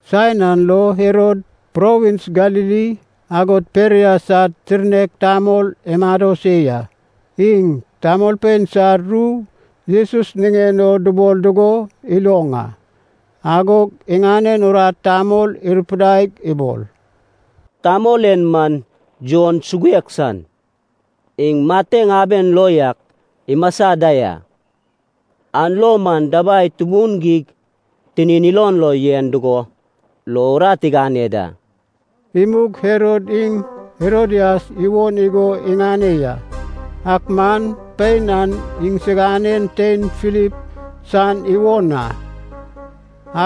Saen an lo Herod, provins Galili agod Perea sad tirnek tamol imado se ya. Iŋ tamolpein sad ru Jesus niŋen o dubol dugo iloŋ a. Agog iŋanen urat tamol irupidaig ibol, “Tamol en man Jon suguek san. Iŋ mateŋ aben lo yak imasa da ya, an lo man dabai tubun geig tinin ilon lo yen dugo lo urat igane da.” Imug Herod iŋ Herodias iwon igo iŋane ya, ak man pein an iŋsiganen tein Filip san iwon a.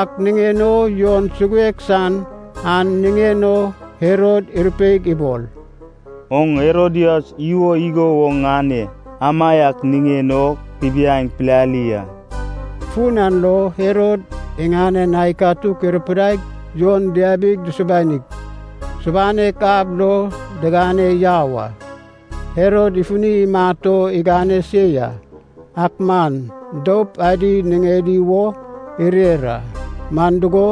Ak niŋen o Jon suguek san an niŋen o Herod irupeig ibol, “Oŋ Herodias iwo igo woŋ ŋane amaiak niŋen o kubiaeŋ pilali a.” Fun an lo Herod iŋanen ai katuk irupidaig Jon diabig, dusubanig, subanek ab lo digane yau a. Herod ifuni imat o igane se ya, ak man doup adi niŋedi wo irer a. Man dugo,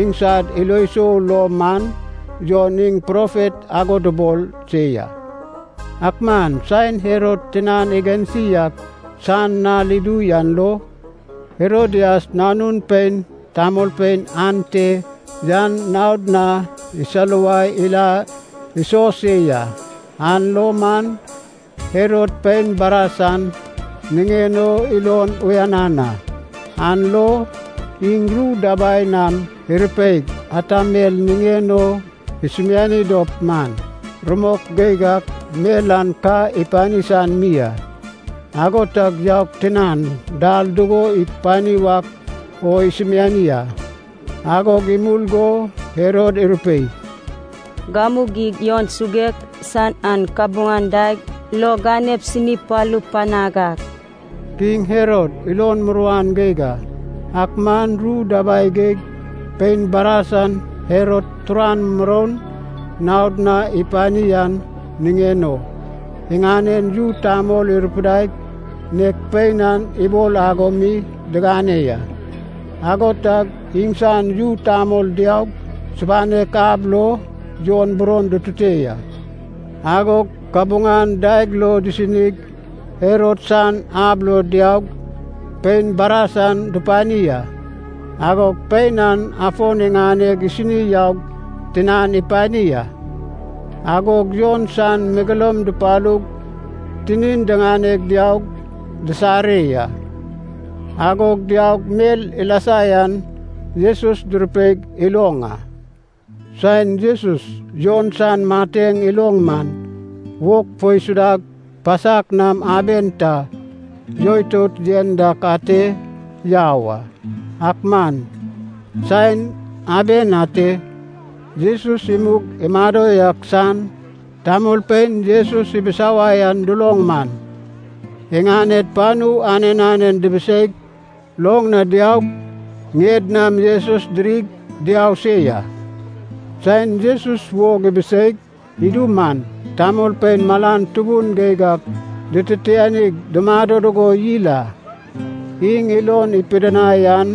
iŋsad ilo sou lo man Jon iŋ profet ago dubol se ya. Ak man saen Herod tinan igansi ak san nal idu yan lo, Herodias nanun pein tamolpein ante yan naod na isaluwai ila iso se ya, an lo man Herod pein baras an niŋen o ilon uyanan a. An lo iŋ ru dabai nam irupeig ata mel niŋen o isumiani dop man, rumok geig ak mel an ka ipani san mi a. Ago tag yaug tinan, dal dugo ipani wak o isumiani a. Agog imul go Herod irupei, “Gamu geig Jon suguek san an kabuŋan daeg lo ganep sini palup panag a!” Kiŋ Herod ilon muruan geig a, ak man ru dabai geig pein baras an Herod turan muroun naod na ipani an niŋen o, iŋanen yu tamol irupidaig nek pein an ibol ago mi digane ya. Ago tag iŋsan yu tamol diaug subanek ab lo Jon buron dutute ya. Agog kabuŋan daeg lo disinig Herod san ab lo diaug pein baras an dupani a. Agog pein an afon iŋaneg isini yaug tinan ipani a. Agog Jon san megeloum dupalug tinin diŋane diaug disare ya. Agog diaug mel ilasa yan Jesus durupeig iloŋ a. Saen Jesus Jon san mateŋ iloŋ man, wog fo isudag pasak nam aben ta yoitout yen dak ate yau a. Ak man saen aben a ate Jesus imug imado yak san tamolpein Jesus ibisawai an duloŋ man, iŋaned panu anen anen dibiseig, loŋ na diaug ŋied nam Jesus dirig diau se ya. Saen Jesus wog ibiseig idu man, tamolpein malan tubun geig ak dititianig dumado dugo yil a. Iŋ ilon ipidinai an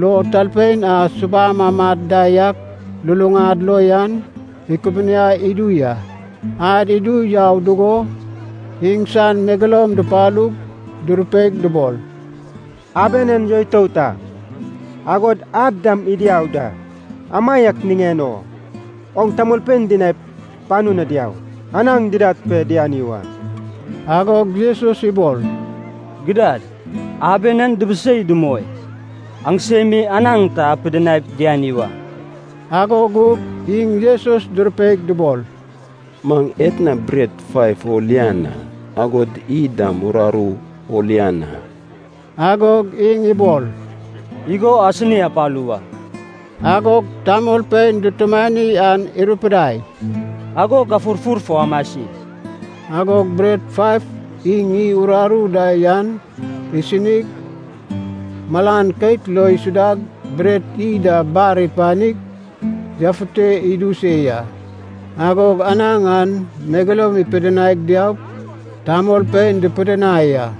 lo talpein a subam amad da yak luluŋad lo yan ikubuniai idu ya. Ad idu yau dugo iŋsan megeloum dupalug durupeig dubol, “Aben en yoitout a, agod ad dam idu yau da, amaiak niŋen o oŋ tamolpein dinaip panu na diaup, anaŋ didad pe diani wa.” Agog Jesus ibol, “Gidad, aben en dibisei dumoi, aŋsem mi anaŋ ta apidinaip diani wa.” Ago gug iŋ Jesus durupeig dubol, “Maŋ etna bret faiv o lian a, agod iy dam uraru o lian a!” Agog iŋ ibol, “Igo asini apalu wa.” Agog tamolpein dutumani an irupidai, “Ago gafurfur fo amasi.” Agog bret faiv iŋ iy uraru da yan isinig, malan keit lo isudag, bret iy da bar ipanig yafute idu se ya. Agog anaŋ an megeloum ipidinaig diaug tamolpein dupidinai a.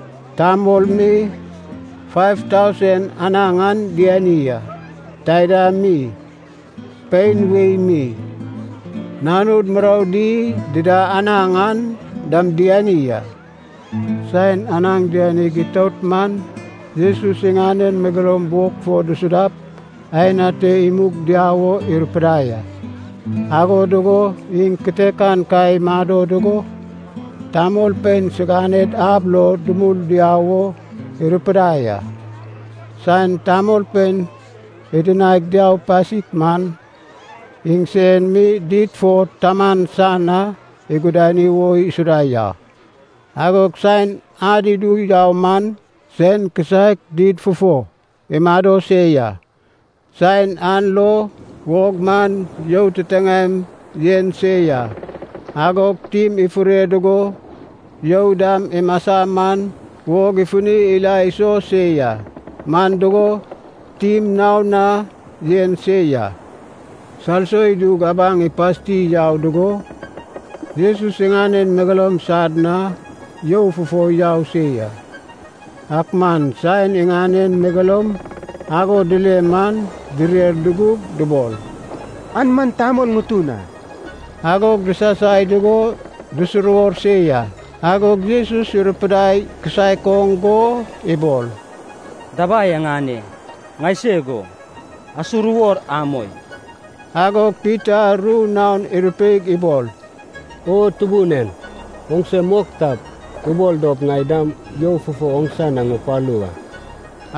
Tamol mi faiv tausen anaŋ an diani a, taida mi pein wei mi, nanud muroudi dida anaŋ an dam diani a. Saen anaŋ dianig itout man Jesus iŋanen megeloum wog fo dusudap aen ate imug diau wo irupidai a. Ago dugo iŋ kitekan ka imado dugo, tamolpein siganed ab lo dumul diau wo irupidai a. Saen tamolpein idinaig diau pasik man, iŋ sen mi did fo Taman san na igudani wo isuda ya. Agog saen ad idu yau man sen kisaek did fufo imado se ya. Saen an lo wog man you titiŋaem yen se ya. Agog tim ifure dugo you dam imasa man wog ifuni ila iso se ya, man dugo tim naon na yen se ya. Salso idug abaŋ ipasti yau dugo, Jesus iŋanen megeloum sad na you fufo yau se ya. Ak man saen iŋanen megeloum ago dile man direr dudug dubol, “An man tamol ŋutun a!” Agog disasai dugo disuruwor se ya. Agog Jesus irupidai kisaek oŋ go ibol, “Dabai aŋane! Ŋaiseg o, asuruwor amoi!” Agog Pita ru naon irupeig ibol, “O Tubun en, oŋse mok tap, ubol dop ŋai dam you fufo oŋsa na ŋupalu wa.”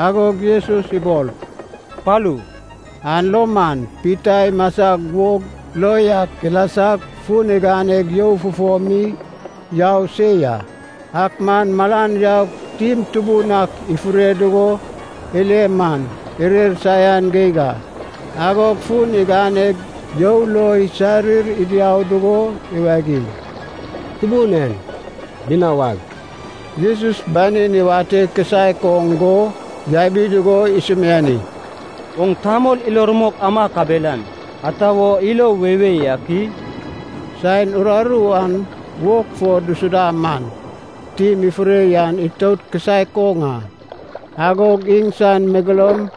Agog Jesus ibol, “Palu!” An lo man Pita imasag wog lo yak ilasag fun iganeg you fufo mi yau se ya. Ak man malan yaug tim tubun ak ifure dugo ile man irer saian geig a. Agog fun iganeg you lo isarir idiau dugo iwagiŋ, “Tubun en, binawag!” Jesus banin iwate kisaek oŋ go yabi dugo isumiani, “Oŋ tamol ilo rumok ama kabelan, ata wo ilo weiwei ak i?” Saen uraru an wog fo dusuda man, tim ifure yan itout kisaek oŋ a. Agog iŋsan megeloum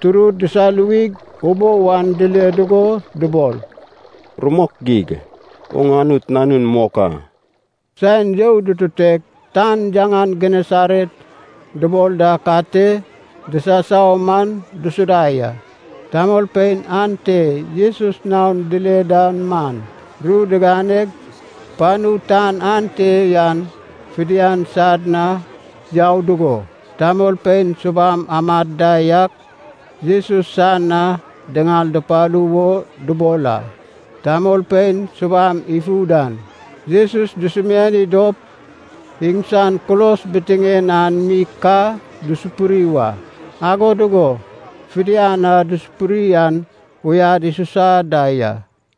turud disaluwig ubou an dile dugo dubol, “Rumok geig, oŋ Anut Nanun mok a!” Saen you dututeg tan yaŋan Genesaret dubol dak ate disasau man dusuda ya. Tamolpein ante Jesus naon dile da man, ru diganeg panu tan ante yan fidian sad na yau dugo, tamolpein subam amad da yak Jesus san na diŋal dupalu wo dubol a. Tamolpein subam ifu dan Jesus dusumiani dop iŋsan kulos bitiŋen an mi ka dusupuri wa. Ago dugo fidian a dusupuri an uyad isusa da ya.